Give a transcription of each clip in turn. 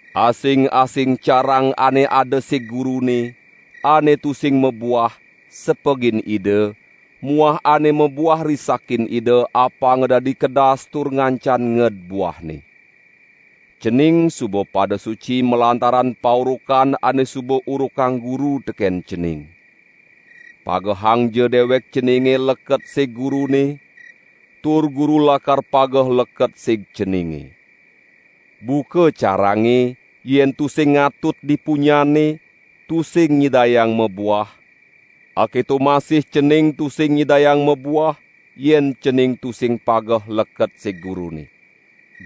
Asing-asing carang ane ada sig Gurune, ane tusing mabuah, sepegin Ida muah ane mabuah risakin Ida apanga dadi kedas tur ngancan nged buahne. Cening suba pada suci malantaran paurukan ane suba urukang Guru teken cening. Pagehangja dewek ceninge leket sig Gurune, tur Guru lakar pageh leket sig ceninge. Buka carange, yen tusing ngatut di punyanne, tusing nyidayang mabuah, aketo masih cening tusing nyidayang mabuah, yen cening tusing pageh leket sig Gurune.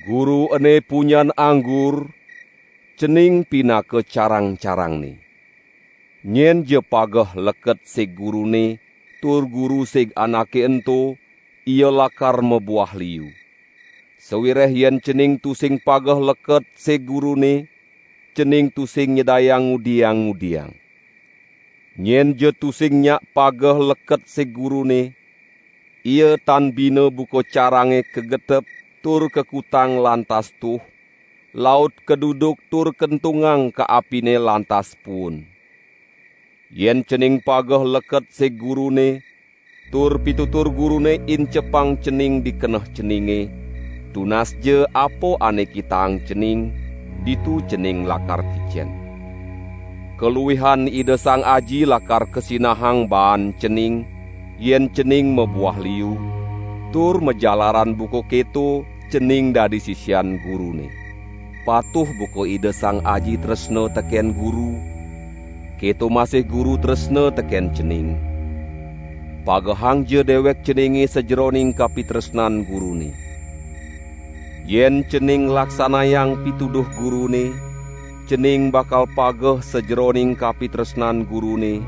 Guru ene punyan anggur; cening pinaka carang-carangne. Nyenja pageh leket sig Gurune tur Guru sig anake ento ia lakar mabuah liu. Sawireh yen cening tusing pageh leket sig Gurune, cening tusing nyidayang ngudiang-ngudiang. Nyenja tusing nyak pageh leket sig Gurune, ia tan bina buka carange kagetep tur kakutang lantas tuh, laut kaduduk tur kentungang ka apine lantas puun. Yen cening pageh leket sig Gurune, tur pitutur Gurune incepang cening di keneh ceninge, tunasja apa ane kitaang cening, ditu cening lakar kicen. Kaluihan Ida Sang Aji lakar kasinahang baan cening, yen cening mabuah liu; tur majalaran buka keto cening dadi sisian Gurune. Patuh buka Ida Sang Aji tresna teken Guru, keto masih Guru tresna teken cening; pagehangja dewek ceninge sajeroning kapitresnan Gurune. Yen cening nglaksanayang pituduh Gurune, cening bakal pageh sajeroning kapitresnan Gurune,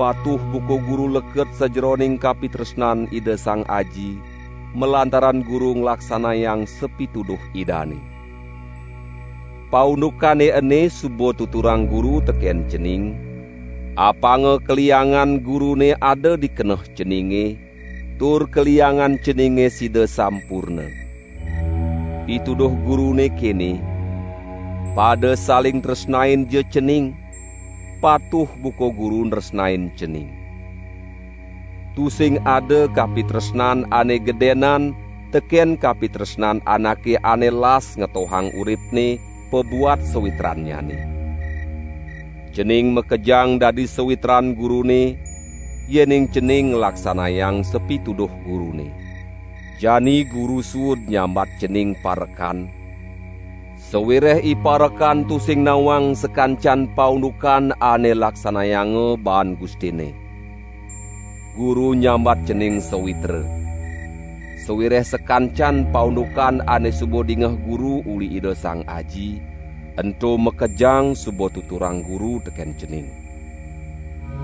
patuh buka Guru leket sajeroning kapitresnan Ida Sang Aji, malantaran Guru nglaksanayang sapituduh Idane. Paundukane ene suba tuturang Guru teken cening, apanga kaliangan Gurune ada di keneh ceninge, tur kaliangan ceninge sida sampurna. Pituduh Gurune kene: pada saling tresnainja cening, patuh buka Guru nresnain cening. Tusing ada kapitresnan ane gedenan teken kapitresnan anake ane las ngetohang uripne pabuat sawitrannyane. Cening makejang dadi sawitran Gurune, yening cening nglaksanayang sapituduh Gurune. Jani Guru suud nyambat cening parekan, sawireh iparekan tusing nawang sakancan paundukan ane laksanayanga baan gustinne. Guru nyambat cening sawitra, sawireh sakancan paundukan ane suba dingeh Guru uli Ida Sang Aji, ento makejang suba tuturang Guru teken cening.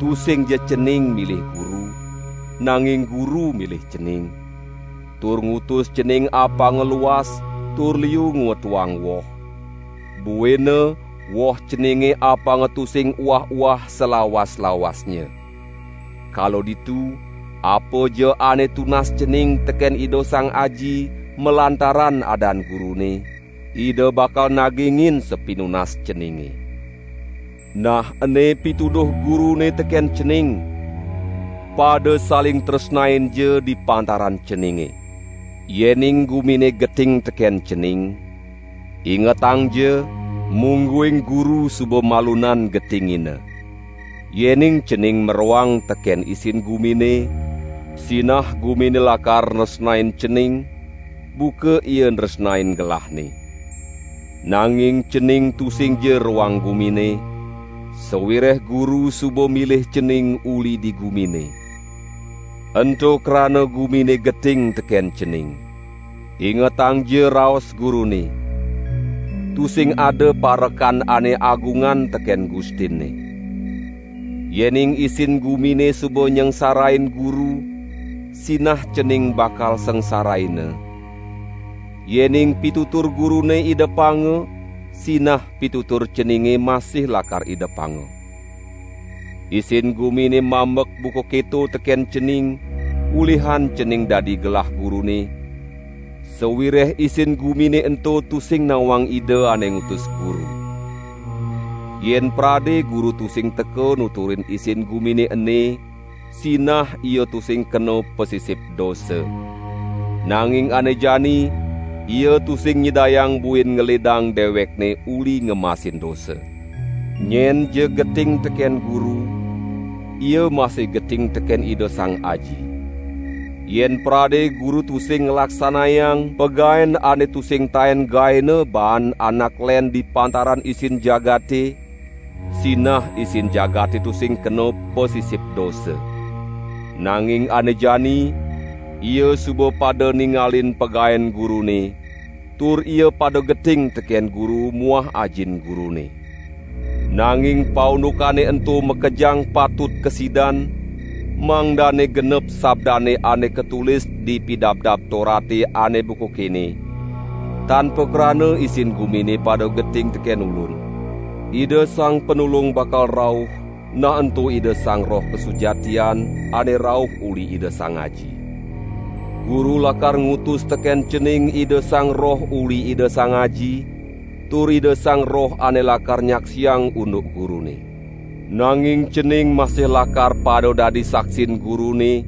Tusingja cening milih Guru, nanging Guru milih cening, tur ngutus cening apang luas tur liu ngwetuang woh, buina woh ceninge apanga tusing uah-uah salawas-lawasnya. Kala ditu apaja ane tunas cening teken Ida Sang Aji, malantaran adan Gurune, Ida bakal nagingin sapinunas ceninge. Nah ene pituduh Gurune teken cening: pada saling tresnainja di pantaran ceninge!" "Yening gumine geting teken cening, ingetangja, mungguing Guru suba malunan getingina. Yening cening maroang teken isin gumine, sinah gumine lakar nresnain cening, buka ia nresnain gelahne. Nanging cening tusingja roang gumine, sawireh Guru suba milih cening uli di gumine. Ento krana gumine geting teken cening. Ingetangja raos Gurune: 'Tusing ada parekan ane agungan teken gustinne.' Yening isin gumine suba nyangsarain Guru sinah cening bakal sangsaraina; yening pitutur Gurune idepanga, sinah pitutur ceninge masih lakar idepanga. Isin gumine mambek buka keto teken cening, ulihan cening dadi gelah Gurune; sawireh isin gumine ento tusing nawang Ida ane ngutus Guru. Yen prade Guru tusing teka nuturin isin gumine ene, sinah ia tusing kena pasisip dosa; nanging ane jani ia tusing nyidayang buin ngelidang dewekne uli ngemasin dosa. Nyenja geting teken Guru, ia masih geting teken Ida Sang Aji. Yen prade Guru tusing nglaksanayang pagaen ane tusing taen gaena baan anak len di pantaran isin jagate, sinah isin jagate tusing kena pasisip dosa; nanging ane jani, ia suba pada ningalin pagaen Gurune, tur ia pada geting teken Guru muah Ajin Gurune. Nanging paundukane ento makejang patut kasidan, mangdane genep sabdane ane katulis di Pidabdab Torate ane buka kene: 'Tan pakrana isin gumine pada geting teken Ulun.' Ida Sang Panulung bakal rauh, nah ento Ida Sang Roh Kasujatian, ane rauh uli Ida Sang Aji. Guru lakar ngutus teken cening Ida Sang Roh uli Ida Sang Aji, tur Ida Sang Roh ane lakar nyaksiang unduk Gurune. Nanging cening masih lakar pada dadi saksin Gurune,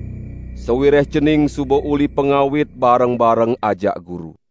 sawireh cening suba uli pangawit bareng-bareng ajak Guru."